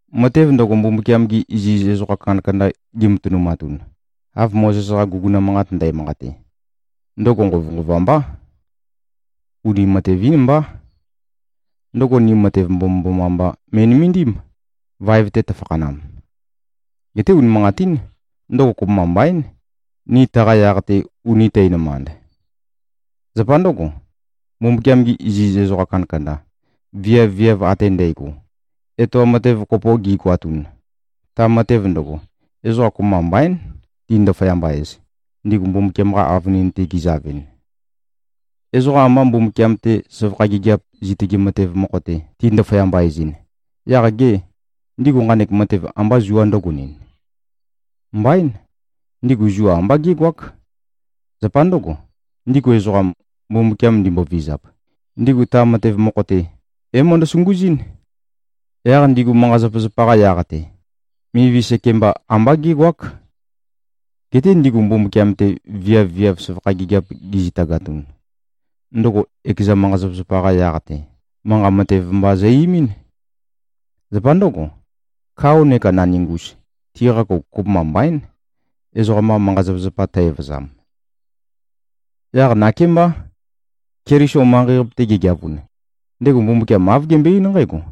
Matev ndøgo, Mbumbukiam-gi iziz ezoqa kandakanda gimatønumatun, av Mozes-qa guguna manqat ndæmanqate, ndøgo nqovønqova mbá. Uni matev-ín mbá. Ndøgo ni matev mbomømboma mba me꞉nømendím, vaev-te tøfakhanam. Geté, unimanqatín, ndøgo kopømba mbaín, ni taqa yaq-te uni tænømand. Zapa ndǿgo, Mbumbukiam-gi iziz ezoqa kandakanda, viav-viav ate ndægo, etoam matev kopo gigoatun, ta matev ndøgo, ezoqa kopømba mbaín, ti꞉-ndaføyamba-ez, ndigu Mbumbukiam-qa avønin-te gizavɨn. Ezoqa amba Mbumbukiam-te søvakha gigiap zitøge matev mokho-te ti꞉-ndaføyamba-ezɨn, yaq gê, ndigu nqanek matev amba zua ndǿgonɨn? Mbaín! Ndigu zua amba gégoák. Zapa ndǿgo, ndigu ezoqam, Mbumbukiam ndimbovizap, ndigu ta matev mokho-te, é-møndø-sunguzɨ́n, yaq ndigu manqa-zapazapa-qa yaq-te, mivi sekemba ambá gégoák. Geté ndigu Mbumbukiam-te viav-viav søvakha gigiap gizitagatun, ndøgo ekeza manqa-zapazapa-qa yaq-te, manqa matev mba zø-eimín. Zapa ndǿgo, kao neka naningus, tiqa kouk kopømba mbaín, ezoqam-qa manqa-zapazapa tø-evøzam. Yaq nakémbá, Keliso manqei-qape-te gegeavun, ndego Mbumbukiam āv gembøe-eín nqǽgo,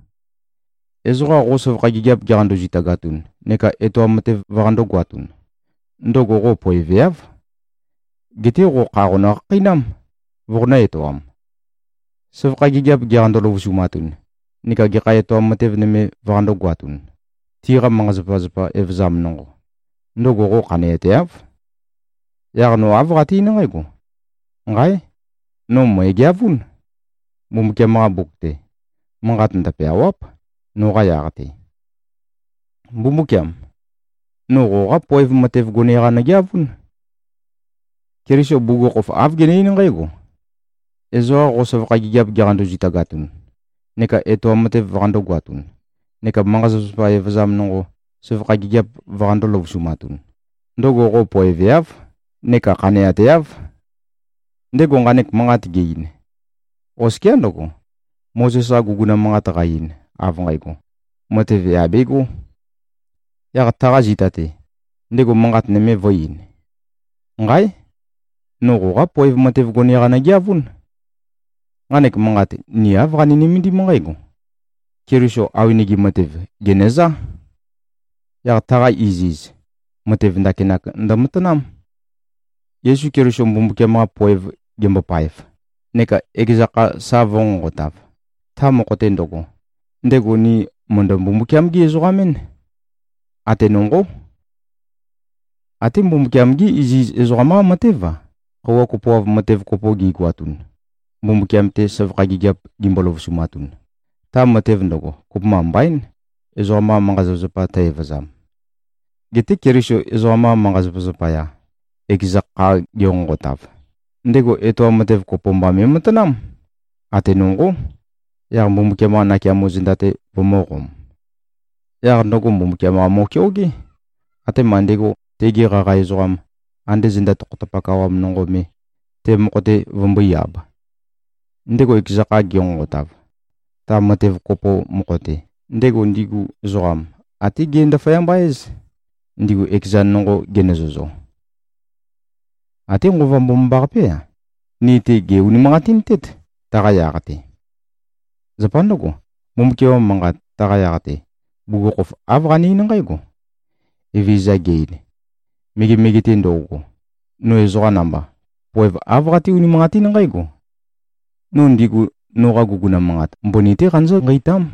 “Ezoqa qo søvakha gigiap giqando-zitagatun neka etoam matev vøqandō-goatun, ndøgo qo poeveáv. Geté qo kha qonø-khakheinám, voqonø̄-etoam. Søvakha gigiap giqando-løvusumatun neka gekha etoam matev nøme vøqandō-goatun, tiqa manqa-zapazapa evøzam nonqo, ndøgo qo khaneateáv. Yaq no āv qate-eín nqǽgo: Nqáe! No mø̀egeavún. Mbumbukiam-qa Mbuk-te, manqat ndøpeâwáp, noqa yaq-te. Mbumbúkiam! No qoqá poev matev gone-qa nøgeavún.” Keliso bugukhokhof, āv gene-eín nqǽgo, “Ezoqa qo søvakha gigiap giqando-zitagatun neka etoam matev vøqandō-goatun neka manqa-zapazapa evøzam nonqo søvakha gigiap vøqandō-løvusumatun, ndøgo qo poeveáv neka khaneateáv.” Ndego nqanek manqat ge-ein, oskiá ndøgo, Mozes-qa guguna manqat qa-ein, av nqægo, matev yà begó. Yaq taqa zita-te, ndego manqat nøme vø̄-ein, “Nqáe! No qoqá poev matev gone-qa nøgeavún.” Nqanek manqat, ni āv qani-nømendím nqǽgo: Keliso awenege matev, gènøzá. Yaq taqa iziz, matev ndakinak ndømatanám. Yesu Keliso Mbumbukiam-qa poev gembopaev, neka ekeza kha sa vø̄nqonqotav, ta mokho-te ndøgo, ndego ni mø̀ndø-Mbumbukiam-gí-ezoqam-én. Ate nonqó. Até Mbumbukiam-gí iziz ezoqam-qá matév-a, khøuwa kopoav matev kopo gigoatun, Mbumbukiam-te søvakha gigiap gimbo-løvusumatun, ta matev ndøgo, kopømba mbaín, ezoqam-qa manqa-zapazapa tø-evøzam. Geté Keliso ezoqam-qa manqa-zapazapa zapaya, ekeza kha genqonqotav, ndego etoam matev kopo mba me꞉matanám, ate nonqó, yaq Mbumbukiam-qa nakeamo zenda-te, vømø̄qom. Yaq ndøgo Mbumbukiam-qa mo꞉keogé, atema ndego tegi qaqa ezoqam, ande zenda tokhotapak awam nonqo me, te mokho-te vømbøí-āb. Ndego ekeza kha genqonqotav, ta matev kopo mokho-te, ndego ndigu ezoqam até ge-ndaføyamba-éz, ndigu ekezan nonqo genøzøzo. Até Nqova Mbomambaqapé-a, ni-te gè-unimanqatintét, taqa yaq-te. Zapa ndǿgo, Mbumbukiam-qa Manqat taqa yaq-te, bugukhokhof āv qane-eín nqǽgo, “Evezøza ge-ein: Megemege-te ndo꞉go, no ezoqa namba, poev āv qaté-unimanqatín nqǽgo: No ndigu noqa guguna manqat, mbøni-té qanøzǿ-nqeitám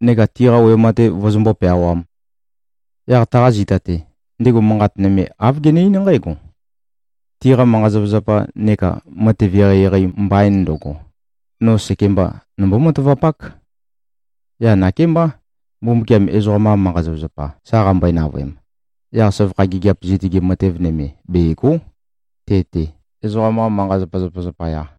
neka tiqa wema-te vøzømbó-peawām.” Yaq taqa zita-te, ndego manqat nøme, āv gene-eín nqǽgo, “Tiqa manqa-zapazapa neka matev eqeieqei mbain ndøgo, no sekemba nombó-matavapák.” Yaq nakémbá. Mbumbukiam ezoqam-qa manqa-zapazapa sa qambøe-navøem, yaq søvakha gigiap zitøge matev nøme bègo᷄, te-te, ezoqam-qa manqa-zapazapa zapaya.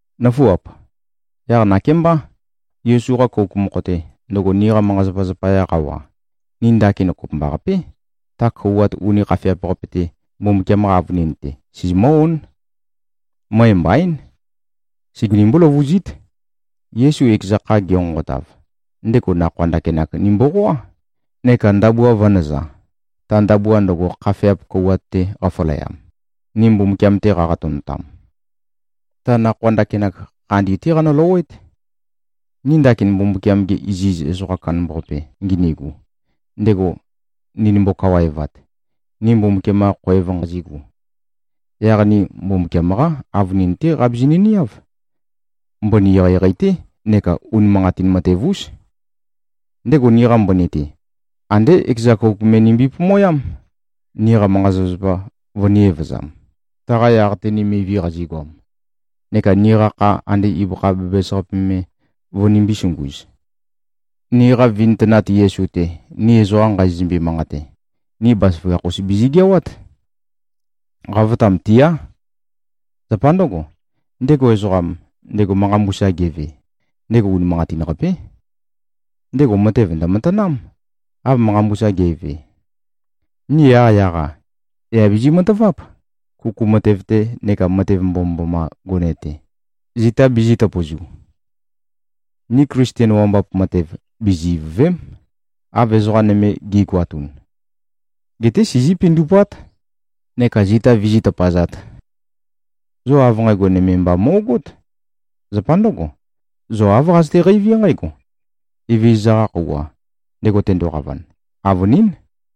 Nǿfuap! Yaq nakémbá, Yesu-qa kouk mokho-te, ndøgo niqa manqa-zapazapa zapaya qawa, ni ndakin kopømbaqapé, ta kouwat uni khafeap-qape-te, Mbumbukiam-qa avønin-te, sizimǿ-ón. Møe mbaín. Segenimbú-løvuzít. Yesu ekeza kha genqonqotav, ndego nakhoa ndakinak nimboqoá, neka ndabua vø̄nøza, ta ndabua ndøgo, khafeap kouwat-te qafaleam, ni Mbumbukiam-te qaqatønotam. Ta nakhoa ndakinak, khandi-té qanøløwé꞉t. Ni ndakin Mbumbukiam-ge iziz ezoqam kandambaqape ginigu, ndego ndinimbo-kawaevat, ni Mbumbukiam-qa khoev nqazigu, yaq ni Mbumbukiam-qá avønin-té qabizinø-niáv. Mbøni eqeieqei-té neka unimanqatin matev-ús. Ndego niqa mbøni-te, andé ekeza kouk me nimbi-pomoyám, niqa manqa-zapazapa vønī-evøzam, taqa yaq-te ni mivi qazigoam, neka niqa kha ande ibøkha bæbæs-qape me vønimbī-sunguz. Niqa vintønat Yesu-te, ni ezoqa nqazizømbe-manqate, ni bazaføgakh-us bizigeawát. Qavotam tiá. Zapa ndǿgo, ndego ezoqam, ndego manqa mbusa geve, ndego unimanqatin-qapé. Ndego matev ndø̀matanám, av manqa mbusa ge꞉ve. Ni yaqyaq-a, yà bizi-mataváp, kuku matev-te neka matev mbomømboma gone-te, zita bizī-tøpøzu. Ni Klisten wambap matev bizi-ivø̀ve᷄m, av ezoqa nøme gi꞉goatun. Geté sizí-pindupát neka zita vizí-tøpazāt. Zo av nqægo nøme mba mo꞉gót. Zapa ndǿgo, zo āv qazøte-qeiví nqǽgo: Evezøza-qa khøuwa, ndego tendoqavan, avønín.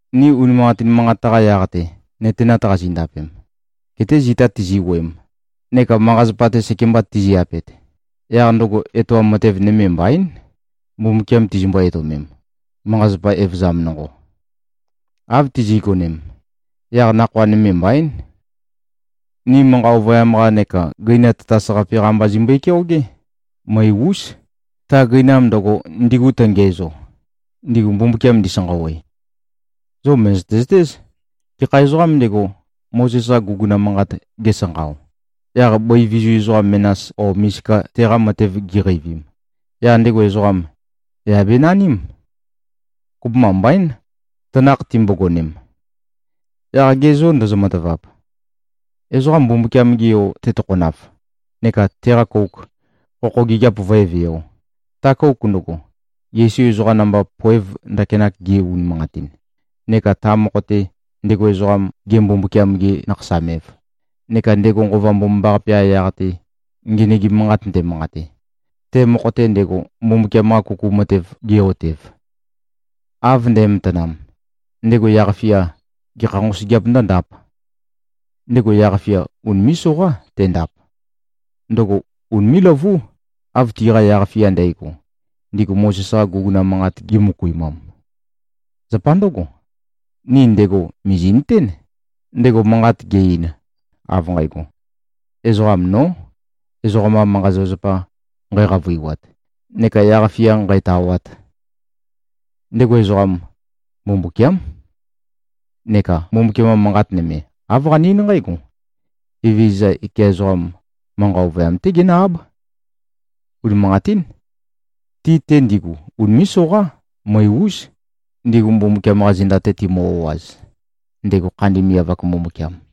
Ni unimanqatin manqat-qa yaq-te nøtenat qazindapem, gete zita tizi-wuøem neka manqa-zapa-te sekemba tizi-apet, yaq ndøgo etoam matev nøme mbaín, Mbumbukiam tizimbo-etøomem, manqa-zapa evøzam nonqo. Av tizi꞉gonem, yaq nakhoa nøme mbaín. Ni manqa ovøyam-qa neka gøina tatas-qape-qa mba zimbøe-keogé, møe-ús, ta gøinam ndøgo, ndigu tøngiæzo, ndigu Mbumbukiam ndisanqawe. Zo mø̀zøte-zøtéz. Gekha ezoqām ndego, Mozes-qa guguna manqat gesanqao, yaq bøi vizu ezoqa menas o misika teqa matev giqeivim, yaq ndego ezoqam, yà benaním. Kopømba mbaín, tanakh timbogonem. Yaq ge zô, ndozo-matavap? Ezoqa Mbumbukiam-ge Yo tetokhonav neka teqa kouk, khokho gigiap vǿe-vēo, ta kouk ndøgo, Yesu ezoqa namba poev ndakinak ge꞉-unimanqatin, neka ta mokho-te, ndego ezoqam, ge-Mbumbukiam-ge-nakhasam-ev, neka ndego Nqova Mbomambaqape-qa yaq-te ngenøgim manqat ndemanqate, te mokho-te ndego, Mbumbukiam-qa kuku matev ge꞉-otev; av nde꞉matanam, ndego yaq-fia gekha nqosøgeap ndǿndāp? Ndego yaq-fia unimé꞉-soqá tendap. Ndøgo unimé꞉-løvú, av tiqa yaq-fia ndægo, ndigu Mozes-qa guguna manqat gimøkuimam. Zapa ndǿgo, ni ndego mìzi꞉nøtén, ndego manqat ge-ein, av nqægo, “Ezoqam nó, ezoqam-qa manqa-zapazapa nqæqavøiwat neka yaq-fia nqǣtāwāt.” Ndego ezoqam, Mbumbukiám. Neka Mbumbukiam-qa Manqat nøme, āv qane-eín nqǽgo, “Evezøza ekeza ezoqam manqa ovøyam-té genǿ-áb.” Unimanqatín. Ti-te ndigu unimé꞉-soqá, møe-ús, ndigu Mbumbukiam-qa zenda-te timø-o꞉az, ndego khandi miav-ak Mbumbukiam.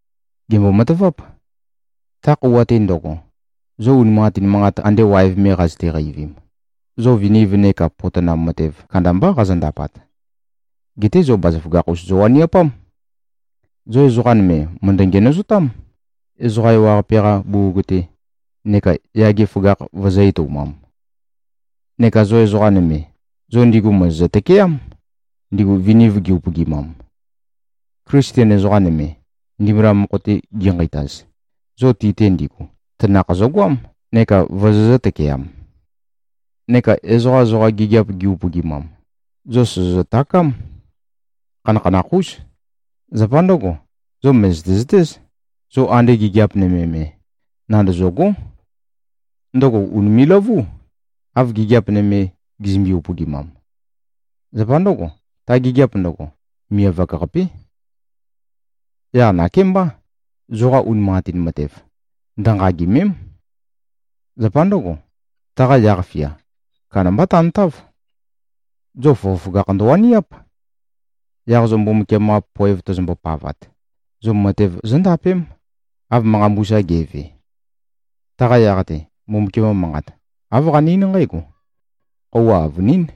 Gèmbo-mataváp. Ta khøuwa-te ndøgo, zo unimanqatin manqat, ande waev me qazøte-qeivim, zo viniv neka potonam matev kandambá qazondapat. Geté zo bazaføgakh-us zowaniapám. Zo ezoqa nøme mø̀ndø-ngenøzotám, ezoqa ewaqape-qa bugug-te, neka yage føgakh vøzø̄-etoumam. Neka zo ezoqa nøme, zo ndigu mòzozø-tøkeám, ndigu viniv gi-upøgimam. Klisten ezoqa nøme, ndimbula mokho-te ginqeitaz, zo ti-te ndigu, tanakh zøgoám neka vozozø̄-tøkeam. Neka ezoqa zoqa gigiap gizø-upøgimam, zo sòzozø-takám. Khanakhanakh-ús. Zapa ndǿgo, zo mø̀zøte-zøtéz, zo ande gigiap nøme me, nandøzø̂gó. Ndøgo ùnime꞉-løvú, av gigiap nøme, gizømbe-upøgimam. Zapa ndǿgo, ta gigiap ndøgo, miav-ak-qapé. Yaq nakémbá, zoqa unimanqatin matev, ndønqagìme᷄m. Zapa ndǿgo, taqa yaq-fia kandambá tantáv. Zo føgøføgakh ndøwaniáp. Yaq zo Mbumbukiam-qa poev tozombo-pavat, zo matev zóndapém, av manqa mbusa ge꞉ve. Taqa yaq-te, Mbumbukiam-qa Manqat, āv qane-eín nqǽgo, “Khøuwa avønín.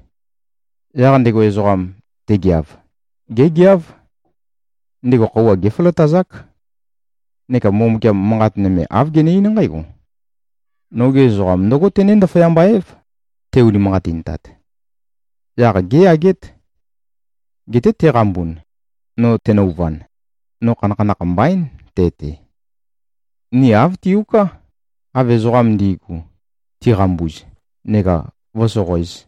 Yaq ndego ezoqam, tegeav, gégeáv. Ndego khøuwa géføløtazák.” Neka Mbumbukiam, manqat nøme āv gene-eín nqǽgo, “Noge ezoqam ndǿgo tené-ndaføyamba-év, te-unimanqatintat. Yaq géyagét. Geté teqambun, no tenøuvan, no khanakhanakh mbaín, te-te.” Ni āv tiuká, av ezoqam ndi꞉gu, tiqambuz, neka vǿsoqoēz.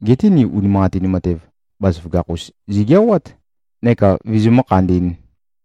Geté ni unimanqatin matev, bazaføgakh-us zigeawát, neka vizimǿ-khandī꞉n.